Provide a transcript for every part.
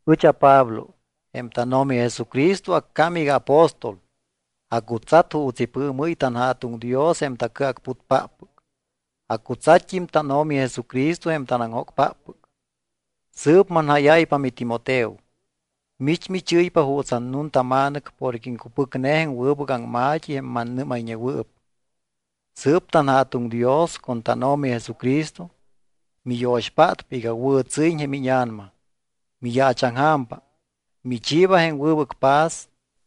Ɨch aPablo. Jém tánO̱mi Jesucristo accám iga aapóstol. Acutsat juuts ipɨɨmɨ́y tanJa̱tuŋ Dios jém tacɨacputpáppɨc. Acutsatt́im tánO̱mi Jesucristo jém tanaŋjóctampáppɨc. Sɨɨp manjáyáypa miTimoteo. Mich michɨ́ypa juuts annuntama̱nɨc porque iŋcupɨcne jém wɨbɨc aŋma̱t́i jém manamíñayñewɨɨp. Sɨɨp tanJa̱tuŋ Dios con tánO̱mi Jesucristo miyo̱xpátpa iga wɨ̱tsɨ́yiñ jém íña̱nama. Miyaachaŋja̱mpa. Michiiba jém wɨbɨc paz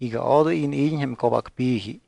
iga odoy iniid́iñ jém co̱bacpi̱ji.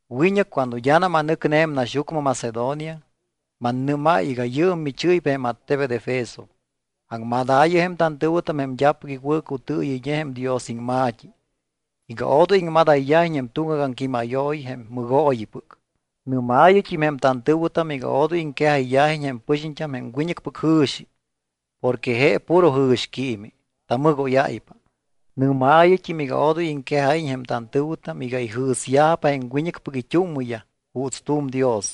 Wiñɨc cuando d́anam anɨcne jém naxyucmɨ Macedonia, mannɨ́máy iga yɨɨm michɨ́ypa jém attebet Efeso. Aŋmadaayɨ jém tantɨ̱wɨtam jém d́apɨc iwɨ̱cutɨɨyɨyñe jém Dios iŋma̱t́i iga odoy iŋmadayyajiñ jém tuŋgac aŋquímayooyi jém mɨgooyipɨc. Nɨ́maayɨt́im jém tantɨ̱wɨtam iga odoy iŋquejayyajiñ jém pɨxiñt́am jém wiñɨcpɨc jɨ̱xi porque je puro jɨ̱xquiimi, tamɨgóyáypa. Nɨ́maayɨt́im iga odoy iŋquejáyiñ jém tantɨ̱wɨtam iga ijɨ̱syajpa jém wiñɨcpɨc it́úmmɨyaj juuts tu̱m dios.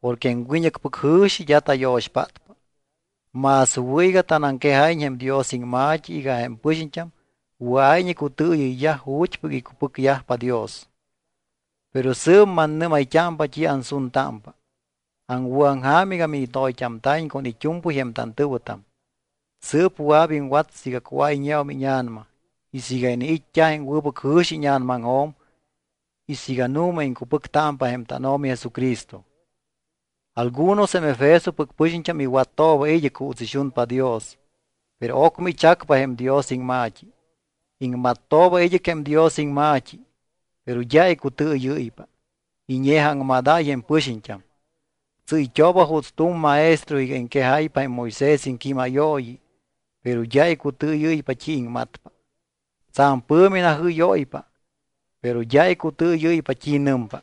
Porque jém wiñɨcpɨc jɨ̱xi d́a tayo̱xpátpa. Más wɨ̱ iga tanaŋquejáyiñ jém Dios iŋma̱t́i iga jém pɨxiñt́am wɨa̱iñ icutɨɨyɨyyaj ju̱t́pɨc icupɨcyajpa Dios. Pero sɨɨp mannɨ́mayt́ámpa t́i ansuntámpa. Aŋwɨ̱aŋja̱m iga minitoyt́amta̱iñ con it́u̱mpɨy jém tantɨ̱wɨtam. Sɨɨp wɨa̱p iŋwat siiga cuáyñeum íña̱nama y siiga iniit́t́a jém wɨbɨc jɨ̱xi íña̱namaŋjo̱m y siiga nu̱ma iŋcupɨctámpa jém tánO̱mi Jesucristo. Algunos jém Efesopɨc pɨxiñt́am iwattooba id́ɨc juuts ixunpa Dios, pero ocmɨ ichacpa jém Dios iŋma̱t́i. Iŋmattooba id́ɨc jém Dios iŋma̱t́i, pero d́a icutɨɨyɨ́ypa. Iñe̱jaaŋmadáy jém pɨxiñt́am. Tsɨ́yt́ooba juuts tu̱m maestro iga iŋquejáypa jém Moisés iŋquímayooyi, pero d́a icutɨɨyɨ́ypa t́i iŋmatpa. Tsa̱m pɨ̱mi najɨ́yóypa, pero d́a icutɨɨyɨ́ypa t́i nɨmpa.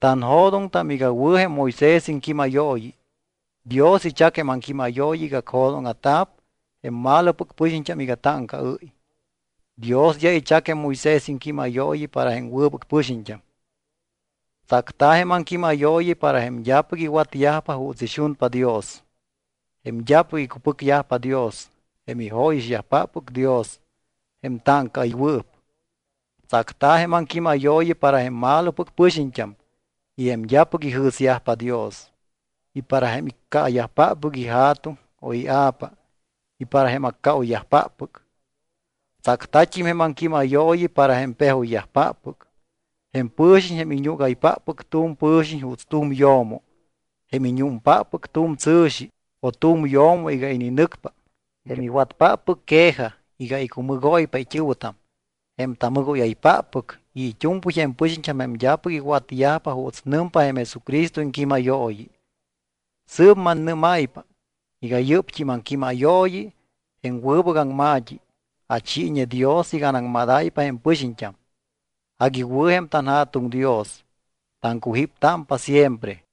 Tanjo̱doŋtam iga wɨ̱ jém Moisés iŋquímayooyi. Dios ichac jém aŋquímayooyi iga acjo̱dóŋa̱ta̱p jém malopɨc pɨxiñt́am iga táŋcaɨ́y. Dios d́a ichac jém Moisés iŋquímayooyi para jém wɨbɨc pɨxiñt́am. Tsacta̱ jém aŋquímayooyi para jém d́apɨc iwatyajpa juuts ixunpa Dios, jém d́apɨc icupɨcyajpa Dios, jém ijóyixyajpáppɨc Dios, jém táŋcaɨywɨɨp. Tsacta̱ jém aŋquímayooyi para jém malopɨc pɨxiñt́am y jém d́apɨc ijɨ̱syajpa Dios, y para jém iccaayajpáppɨc ija̱tuŋ o ia̱pa y para jém accaoyyajpáppɨc. Tsacta̱t́im jém aŋquímayooyi para jém pejoyyajpáppɨc, jém pɨ̱xiñ jém iñúgaypáppɨc tu̱m pɨ̱xiñ juuts tu̱m yo̱mo, jém iñúmpáppɨc tu̱m tsɨ̱xi o tu̱m yo̱mo iga ininɨcpa, jém iwatpáppɨc quejaj iga icumɨgóypa it́ɨ̱wɨtam, jém tamɨgóyaypáppɨc y it́u̱mpɨy jém pɨxiñt́am jém d́apɨc iwatyajpa juuts nɨmpa jém Jesucristo iŋquímayooyi. Sɨɨp mannɨ́máypa iga yɨ́pt́im aŋquímayooyi, jém wɨbɨc aŋma̱t́i, achiiñe Dios iga anaŋmadáypa jém pɨxiñt́am. Agui wɨ̱ jém tanJa̱tuŋ Dios. Taŋcujíptámpa siempre.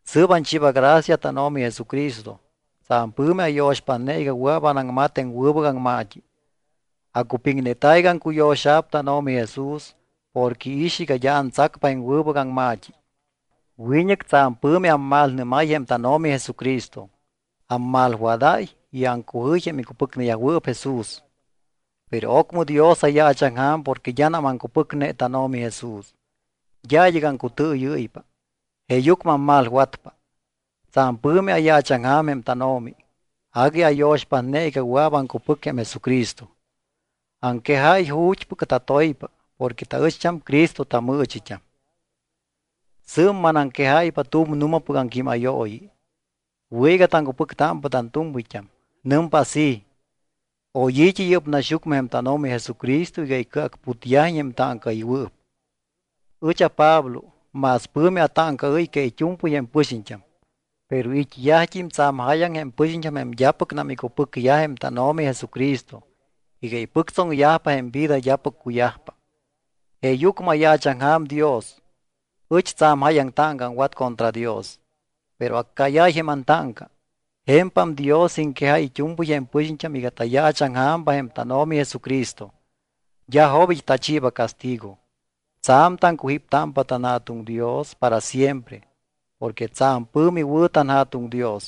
Sɨɨp anchiiba gracia tánO̱mi Jesucristo. Tsa̱m pɨ̱mi ayo̱xpátne iga wɨa̱p anaŋmat jém wɨbɨc aŋma̱t́i. Acupiŋneta̱ iga aŋcuyo̱xa̱p tánO̱mi Jesús porque iix iga d́a antsacpa jém wɨbɨc aŋma̱t́i. Wiñɨc tsa̱m pɨ̱mi ammalnɨ́máy jém tánO̱mi Jesucristo. Ammalwadáy y aŋcujɨy jém icupɨcneyajwɨɨp Jesús. Pero ocmɨ Dios ayaachaŋja̱m porque d́anam aŋcupɨcne tánO̱mi Jesús. D́a id́ɨc aŋcutɨɨyɨ́ypa, jeeyucmɨ ammalwatpa. Tsa̱m pɨ̱mi ayaachaŋja̱m jém tánO̱mi. Agui ayo̱xpátne iga wɨa̱p aŋcupɨc jém Jesucristo. Aŋquejáy ju̱t́pɨc tatoypa porque taɨcht́am Cristo tamɨɨchit́am. Sɨɨp manaŋquejáypa tu̱m nu̱mapɨc aŋquímayooyi. Wɨ̱ iga taŋcupɨctámpa tantu̱mpɨyt́am. Nɨmpa así: Oy i̱t́i yɨ́p naxyucmɨ jém tánO̱mi Jesucristo iga icɨacputyajiñ jém táŋcaɨywɨɨp. Ɨch aPablo más pɨ̱mi atáŋcaɨ́y que it́u̱mpɨy jém pɨxiñt́am. Pero it́yajt́im tsa̱m jáyaŋ jém pɨxiñt́am jém d́apɨcnam icupɨcyaj jém tánO̱mi Jesucristo iga ipɨctsoŋyajpa jém vida d́apɨc cuyajpa. Jeeyucmɨ ayaachaŋja̱m Dios. Ɨch tsa̱m jáyaŋ táŋca aŋwat contra Dios, pero accáyáy jém antáŋca. Je̱mpam Dios iŋquejáy it́u̱mpɨy jém pɨxiñt́am iga tayaachaŋja̱mpa jém tánO̱mi Jesucristo. D́a jobit́ tachiiba castigo. Tsa̱m taŋcujíptámpa tanJa̱tuŋ Dios para siempre porque tsa̱m pɨ̱mi wɨ̱ tanJa̱tuŋ Dios.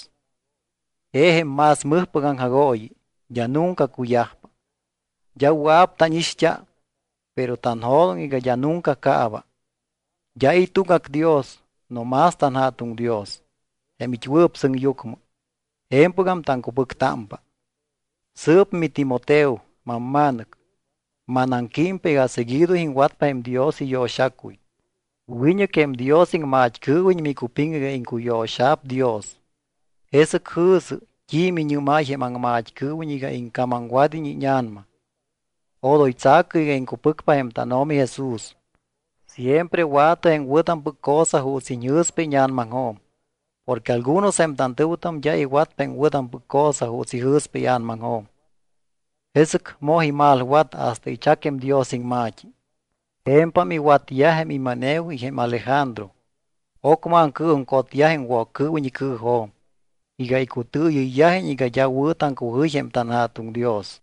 Je jém más mɨjpɨc aŋjagooyi, d́a nunca cuyajpa. D́a wɨa̱p tánixt́a, pero tanjo̱doŋ iga d́a nunca caaba. D́a i̱ tuŋgac Dios no más tanJa̱tuŋ Dios, jém it́wɨɨp sɨŋyucmɨ. Je̱mpɨgam taŋcupɨctámpa. Sɨɨp miTimoteo, mamma̱nɨc, manaŋquímpa iga seguido iŋwatpa jém Dios iyo̱xacuy. Wiñɨc jém Dios iŋmat́cɨɨwiñ micupiŋ iga iŋcuyo̱xa̱p Dios. Jesɨc jɨ̱sɨ t́i miñɨ́máy jém aŋmat́cɨɨwiñ iga iŋcamamwad́iñ íña̱nama. Odoy tsa̱cɨ iga iŋcupɨcpa jém tánO̱mi Jesús. Siempre wa̱tɨ jém wɨ̱tampɨc cosa juuts iñjɨ̱spa íña̱namaŋjo̱m. Porque algunos jém tantɨ̱wɨtam d́a iwatpa jém wɨ̱tampɨc cosa juuts ijɨ̱spa ia̱namaŋjo̱m. Jesɨc moj imalwat hasta ichac jém Dios iŋma̱t́i. Je̱mpam iwatyaj jém Himeneo y jém Alejandro. Ocmɨ aŋcɨɨjuŋcotyaj jém Woccɨɨwiñ icɨɨjo̱m iga icutɨɨyɨyyajiñ iga d́a wɨ̱ taŋcujɨy jém tanJa̱tuŋ Dios.